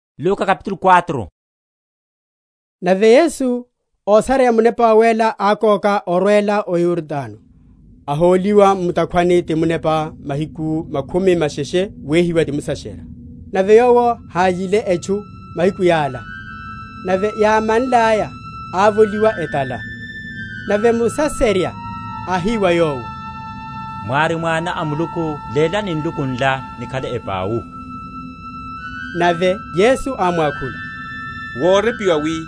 Wehiwa wa Yesu. Nave Yesu, ósareya Munepa Wawéla, ákoka orwela o Yordano, ahóliwa mu’takhwani ti Munepa mahiku makhumi masheshe wehiwa ti Musaserya. Nave Yowo hályile etchu mahiku yala: nave yámanlaya ávoliwa etala. Nave Musaserya áhi wa Yowo, Mwári Mwana a Muluku, lélani nluku nla nikhale epau. Nave Yesu ámwakhula, Worepiwa, wi,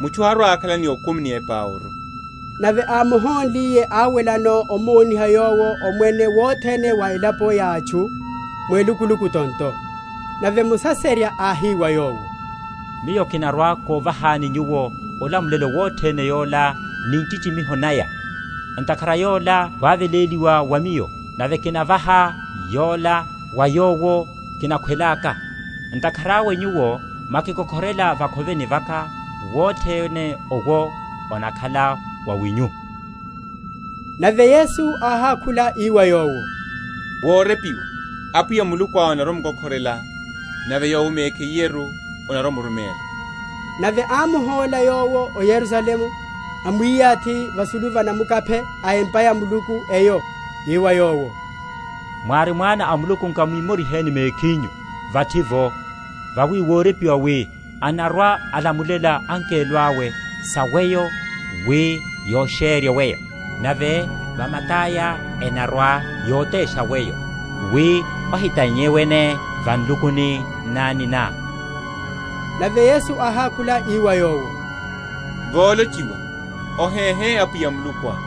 Mutchu harwa‐akhala ni okumi ni epauru. Nave ámuhónliye áwelano, amoniha Yowo omwene wothene wa elapo ya atchu, mu elukuluku tonto. Nave Musaserya áhi wa Yowo, Miyo kinarwa‐kovahani Nyuwo olamulelo wothene yola ni nchichimiho naya: ntakhara yola wáveléliwa wa miyo; nave kinavaha yola wa yowo kinakhwelaka. Ntakhara awe Nyuwo mwakikokhorela va’khoveni vaka, wothene owo onakhala wawinyu. Nave Yesu áhákhula, ii wa yowo, Worepiwa, Apwiya Mulukuá onarwa‐omkokhorela, Nave Yowo mekhiyeru onarwa‐omuruméla. Nave ámuhóla Yowo o Yerusalemu, amwiyathi vasulu va namukaphe a empa ya Muluku eyo, ii wa Yowo, Mwári Mwana a Muluku, nkamwimoriheni mekhinyu vathi’vo: vawi worepiwa wi, Anarwa‐alamulela angelo awe sa weyo, wi yosherye weyo. Nave, Va mata’ya enarwa‐yotesha weyo, Wi ohitannye wene va nlukuni nnani ná. Nave Yesu áhákhula, ii wa yowo, Wolochiwa, Ohéhe Apwiya Mulukuá.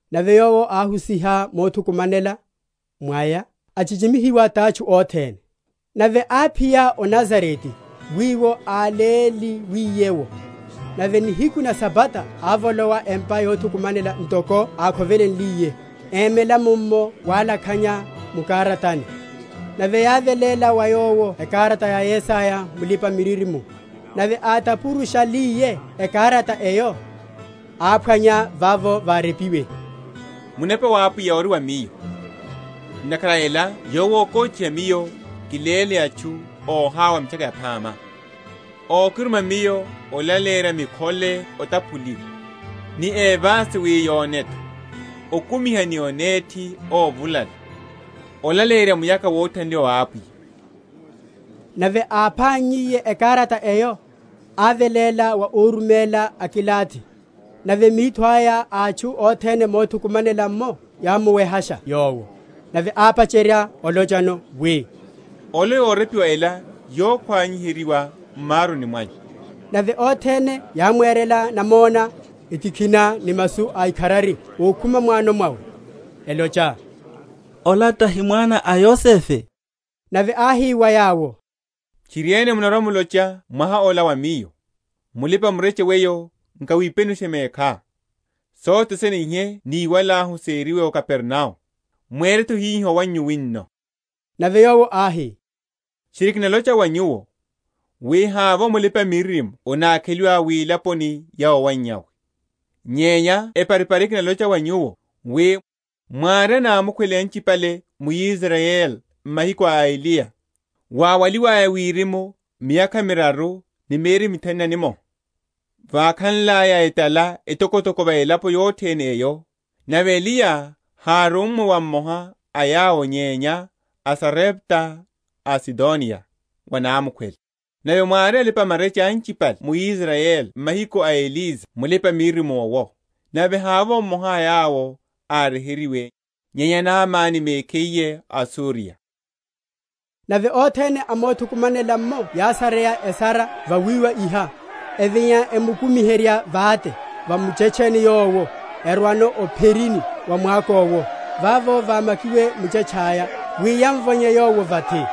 Nave Yowo áhusiha mothukumanela mwaya, achichimihiwa tatchu othene. Nave áphiya o Nazarete, wiwo áleliwiye’wo: nave nihiku na Sabata ávolowa empa yothukumanela, ntoko ákhovelenliye, emela mummo walakhanya mu’karatani. Nave yáveléla wa Yowo ekarata ya Yesaya mulipa‐miririmo. Nave átapurushaliye ekarata eyo, áphwanya vavo várepiwe, Munepa wa Apwiya ori va Miyo, Ntakhara a ela Yowo ákóchiha Miyo kiléle atchu óhawa mitchaka yaphama: Ókiruma Miyo olaleyerya mikhole otaphuliwa, Ni évasi wi yone’tho, Okumiha ni onethi óvulala, Olaleyerya muyakha wothanliwa wa Apwiya. Nave ápannyiye ekarata eyo, áveléla wa óruméla, akilathi: nave mitho aya a atchu othene mothukumanela’mmo yámuwehasha Yowo. Nave ápacherya olochano, wi, Olelo yorepiwa ela yokhwaniheryiwa m’maruni mwanyu. Nave othene yámwerela namona, etikhina, ni masu a ikharari ókhuma m’wano mwawe, elocha, Ola tahi mwana a Yosefe? Nave áhi wa yawo, Tchiriene munarwa‐mulocha mwaha ola wa Miyo, Mulipa‐mureche weyo nkawipenushe mekhá: sothe sene ihe níwalahu seriwe o Kapernao, mwere’tho hiho owannyu wino. Nave Yowo áhi, Tchiri, kinalocha wa nyuwo, wi, Havovo mulipa‐miririmo anákheliwa wilaponi ya owannyawe. Nyenya eparipari kinalocha wa nyuwo, wi, Mwári anamukhwele anchipale mu Israyeli mahiku awe a Eliya, wáwaliwaya wirimu miyakha miraru ni mieri mithanu na mmoha, vákhanlaya etala etokotoko va elaponi yothene eyo; nave Eliya hárummwe wa mmoha a yawo nyenya o Sarepta a Sidoniya, wa namukhwele. Nave mwári alipa‐marecha anchipale mu Israyeli mahiku a Elisa mulipa‐miririmo’wo; nave havovo mmoha a yawo áryeheryiwe, nyenya Naamani mekhiye a o Suriya. Nave othene a mothukumanela’mmo yásareya esara vawiwa iha; evinya emukumiherya vate va muchetche owo, erwano o’pherini wa mwako’wo vavo vámakiwe muchetche aya, wi yamvonye Yowo vathi.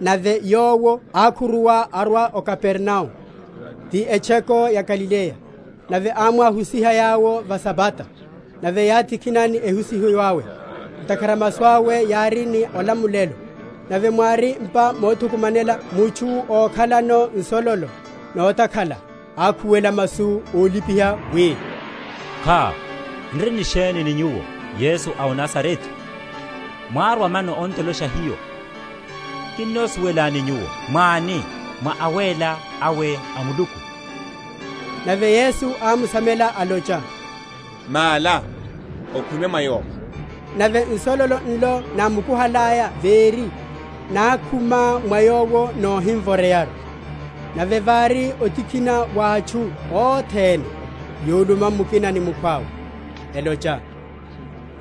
Nave Yowo ákhuruwa arwa o Kapernao, ti etchoko ya Galileya. Nave ámwáhusiha yawo va Sabata: nave yátikhina ni ehusiho yawe; ntakhara masu awe yári ni olamulelo. Nave mwári m’pa mothukumanela mutchu, ókhalano nsololo notakhala; ákhuwela masu ólipiha, wi, Kha! n’ri ni sheni ni Nyuwo, Yesu a o Nazarete? mwárwa mano on’tolosha hiyo? kinnosuwelani Nyuwo mwáni, mwá Awéla awe a Muluku. Nave Yesu ámsamela, alocha, Mála, okhume mwa yowo. Nave nsololo nlo námukuhalaya véri, nákhuma mwa yowo nohimvoreyaru. Nave vári otikhina va atchu othene, yuluma mukina ni mukhwawe, elocha,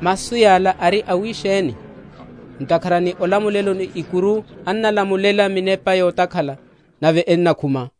Masu yala ari awisheni? ntakhara ni olamulelo ni ikuru anamlamulela minepa yotakhala, nave enamkhuma.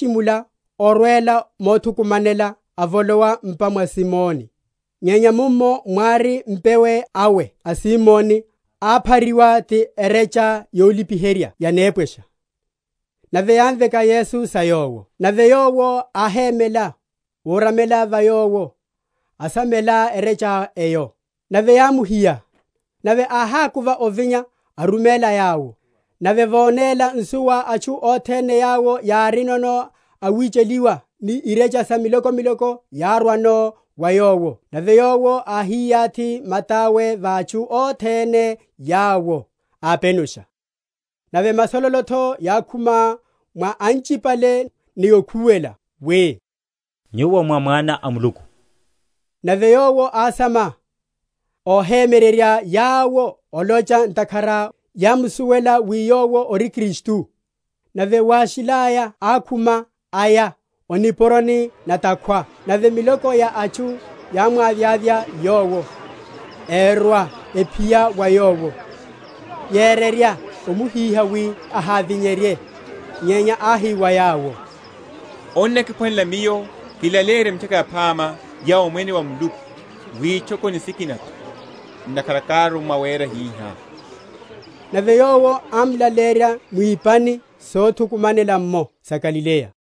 Nave Yowo áchimula orwela mothukumanela, avolowa m’pa mwa Simoni. Nyenya mummo mwári mpewe awe a Simoni, áphariwa ni erecha yolipiherya ya nepwesha; nave yámveka Yesu sa Yowo. Nave Yowo áhémela, úramela va yowo, asamela erecha eyo; nave yámuhiya: nave áhakuva ovinya, áruméla yawo. Nave vónéla nsuwa atchu othene yawo yárino awicheliwa ni irecha sa milokomiloko, yárwano wa Yowo; nave Yowo áhiyathi mata’we va atchu othene yawo, ápenusha. Nave masololo’tho yákhuma mwa anchipale, ni okhuwela, wi, Nyuwo mwá Mwana a Muluku. Nave Yowo ásama, ohemyererya yawo olocha ntakhara yámsuwela wi Yowo ori Kristu. Nave wáshilaya ákhuma aya o nipuroni na’takhwa; nave miloko ya atchu yámwavyavya Yowo, erwa ephiya wa Yowo, yererya omuhíha, wi ahavinyerye. Nyenya áhi wa yawo, Onnakiphwanela Miyo kilaleyerye Mitchaka Yaphama ya Omwene wa Muluku witchokoni sikina’tho: ntakhara kárummwa wera hihá. Nave Yowo ámlaleyerya mwipani sothukumanela’mo sa Galileya.